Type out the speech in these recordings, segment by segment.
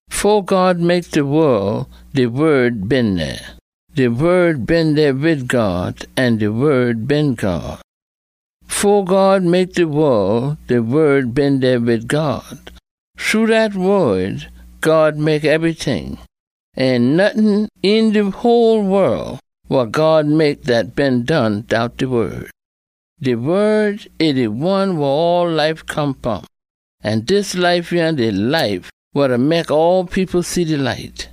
Fo God mek de wol, de Wod been dey. De Wod been dey wid God, an de Wod been God. Fo God mek de wol, de Wod been dey wid God. Shru dat Wod, God mek ebryting. Ain nottin een de whole wol wa God mek dat been done dout de Wod. De Wod, e de one wa all life come fom. An dis life yah de life wa da mek all people see de light.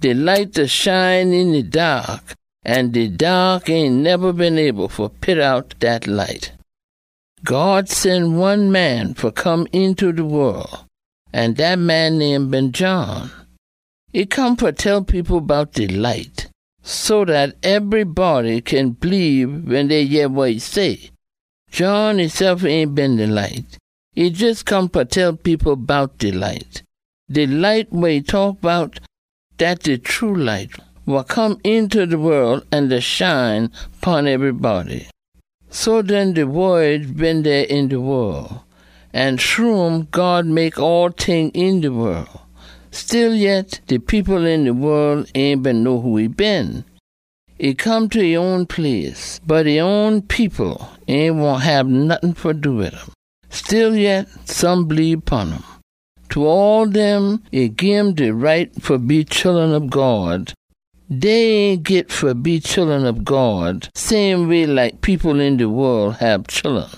De light da shine een de daak, an de daak ain neba been able fa pit out dat light. God sen one man fa come eenta de wol, an dat man name been John. E come fa tell people bout de light, so dat ebrybody kin bleebe wen dey yeh wa e say. John esef ain been de light. E jes come fa tell people bout de light. De light wa e taak bout, dat de true light wa come eenta de wol an da shine pon ebrybody. So den de Wod been dey een de wol, an shru um God mek all ting een de wol. Stillyet, de people een de wol ain been know who e been. E come ta e own place, bot e own people ain wahn hab nottin fa do wid um. Stillyet, some bleebe pon um. Ta all dem, e gim de right fa be chullun ob God. Dey ain git fa be chullun ob God same way like people een de wol hab chullun.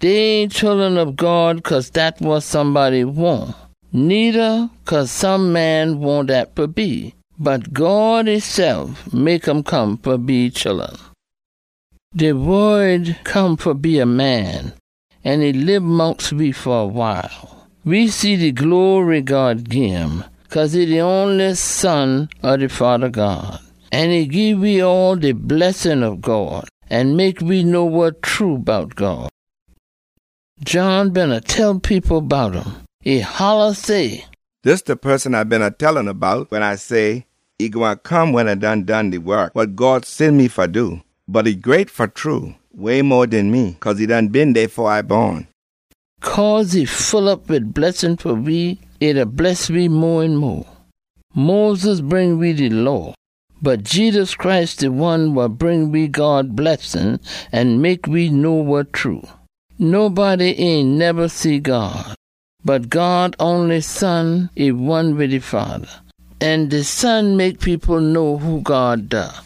Dey ain chullun ob God cause dat wa somebody wahn, needa cause some man wahn dat fa be. Bot God esef mek um come fa be e chullun. De Wod come fa be a man, an e lib mongst we fa a wile. We see de glory God gim, cause e de onliest Son ob de Fada God. An e gii we all de blessin ob God an mek we know wa true bout God. John beena tell people bout um. E holla say, “Dis de poson A beena tell oona bout wen A say, e gwine come wen A done done de wok wa God sen me fa do. Bot e great fa true, way mo den me, cause e done been dey fo A bon.” Cause e full op wid blessin fa we, e da bless we mo an mo. Moses bring we de Law, bot Jedus Christ de one wa bring we God blessin an mek we know wa true. Nobody ain neba see God. Bot God onliest Son, e one wid e Fada, an de Son mek people know who God da.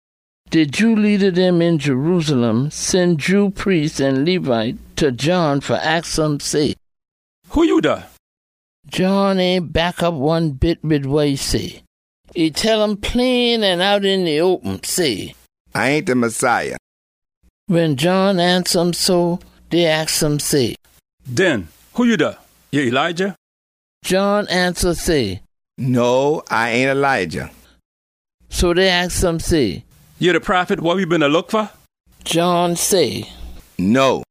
De Jew leada dem een Jerusalem sen Jew priest an Levite ta John fa aks um say, “Who ya da?” John ain back op one bit wid wa e say. E tell um plain an out een de open, say, “A ain de Messiah.” Wen John ansa um so, dey aks um say, “Den who ya da? Ya Elijah?” John ansa say, “No, A ain Elijah.” So dey aks um say, “Ya de Prophet wa we beena look fa?” John say, “No.”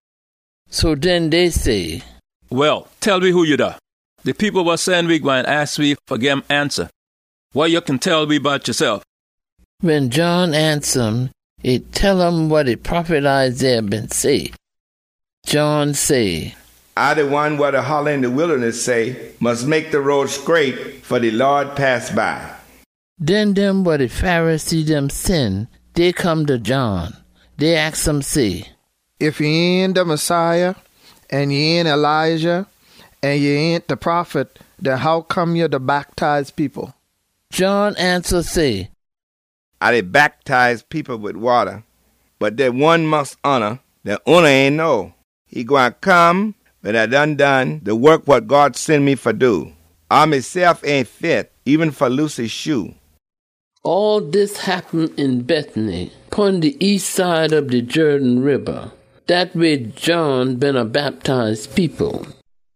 So den dey say, “Well, tell we who ya da. De people wa sen we gwine aks we fa gim ansa. Wa ya kin tell we bout yasef?” Wen John ansa um, e tell um wa de prophet Isaiah been say. John say, “A de one wa da holla een de wildaness say, ‘Mus mek de road scraight fa de Lawd pass by.’” Den dem wa de Pharisee dem sen, dey come ta John. Dey aks um say, “Ef ya ain de Messiah, an ya ain Elijah, an ya ain de Prophet, den hoccome ya da bactize people?” John ansa say, “A da bactize people wid wata, bot dey one mongst oona dat oona ain know. E gwine come wen A done done de wok wa God sen me fa do. A mesef ain fit eben fa loose e shoe.” All dis happen een Bethany, pon de east side ob de Jerden Riba. Dat weh John beena bactize people.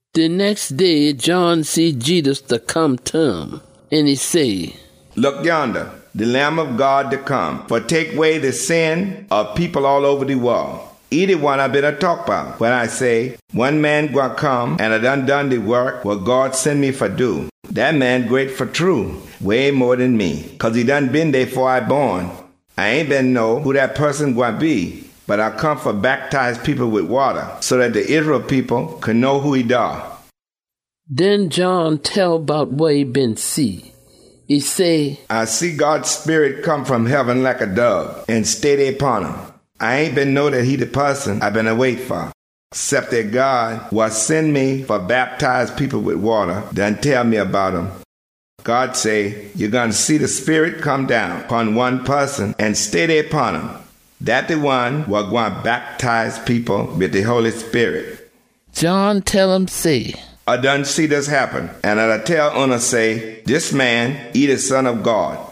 De nex day John see Jedus da come ta um. An e say “Look yonda, de Lamb ob God da come fa tek way de sin ob people all oba de wol! E de one A beena taak bout wen A say, ‘One man gwine come atta A done done de wok wa God sen me fa do. Dat man great fa true, way mo den me, cause e done been dey fo A bon!’ A ain been know who dat poson gwine be, bot A come fa bactize people wid wata so dat de Israel people kin know who e da.” Den John tell bout wa e been see. E say, “A see God Sperit come fom heaben like a dob an stay dey pon um. A ain been know dat e de poson A beena wait fa, cep dat God wa sen me fa bactize people wid wata done tell me bout um. God say, ‘Ya gwine see de Sperit come down pon one poson an stay dey pon um. Dat de one wa gwine bactize people wid de Holy Sperit.’” John tell um say, “A done see dis happen, an A da tell oona say, ‘Dis man, e de Son ob God.’”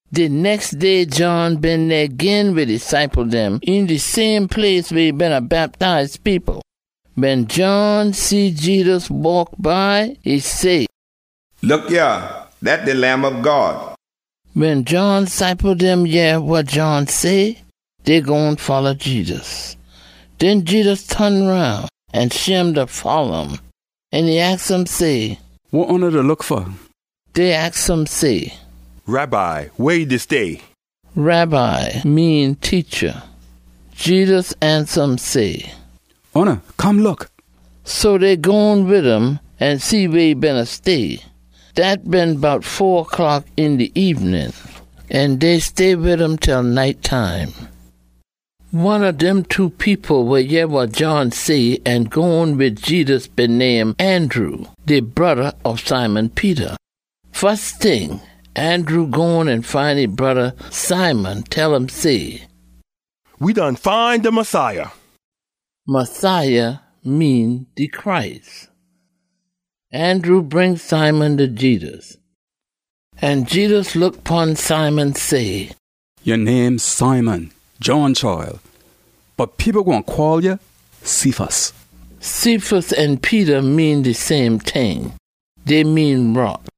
De nex day John been dey gin wid e ciple dem een de same place weh e beena bactize people. Wen John see Jedus waak by, e say, “Look yah! Dat de Lamb ob God!” Wen John ciple dem yeh wa John say, dey gone folla Jedus. Den Jedus ton roun an shim da folla um, an e aks um say, “Wa oona da look fa?” Dey aks um say, “Rabbi, weh ya da stay?” (Rabbi mean “Teacha.”) Jedus ansa um say, “Oona come look!” So dey gone wid um an see weh e beena stay. Dat been bout fo o’clock een de ebenin, an dey stay wid um til night time. One ob dem two people wa yeh wa John say an gone wid Jedus been name Andrew, de broda ob Simon Peter. Fus ting, Andrew gone an find e broda Simon, tell um say, “We done find de Messiah.” (Messiah mean “de Christ.”) Andrew bring Simon ta Jedus. An Jedus look pon Simon say, “Ya name Simon, John chile, bot people gwine call ya Cephas.” (Cephas an Peter mean de same ting. Dey mean “Rock.”)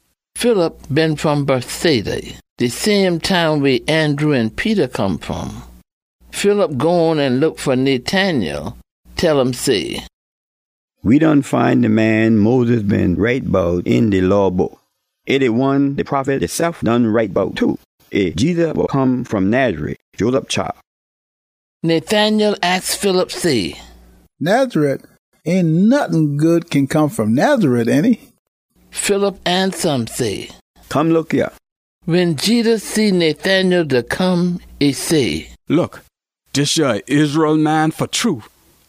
Philip been fom Bethsaida, de same town weh Andrew an Peter come fom. Philip gone an look fa Nathanael, tell um say, “We done find de man Moses been write bout een de Law Book. E de one de prophet deysef done write bout too. E Jedus wa come fom Nazareth, Joseph chile.” Nathanael aks Philip say, “Nazareth! Ain nottin good kin come fom Nazareth, ainty?” Philip ansa um say, “Come look yah!” Wen Jedus see Nathanael da come, e say, “Look! Dis yah a Israel man fa true.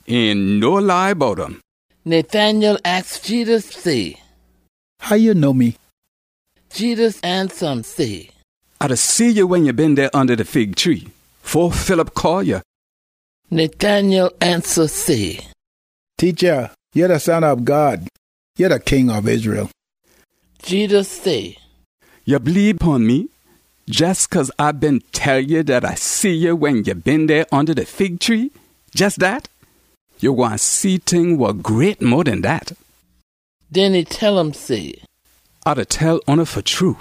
Ain no lie bout um.” Nathanael aks Jedus say, “How ya know me?” Jedus ansa um say, “A done see ya wen ya been dey onda de fig tree, fo Philip call ya.” Nathanael ansa say, “Teacha, ya de Son ob God. Ya de King ob Israel.” Jedus say, “Ya bleebe pon me jes cause A been tell ya dat A see ya wen ya been dey onda de fig tree, jes dat? Ya gwine see ting wa great mo den dat!” Den e tell um say, “A da tell oona fa true,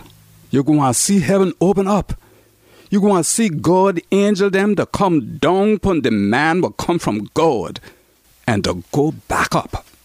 ya gwine see heaben open op. Ya gwine see God angel dem da come down pon de Man wa Come fom God an da go back op.”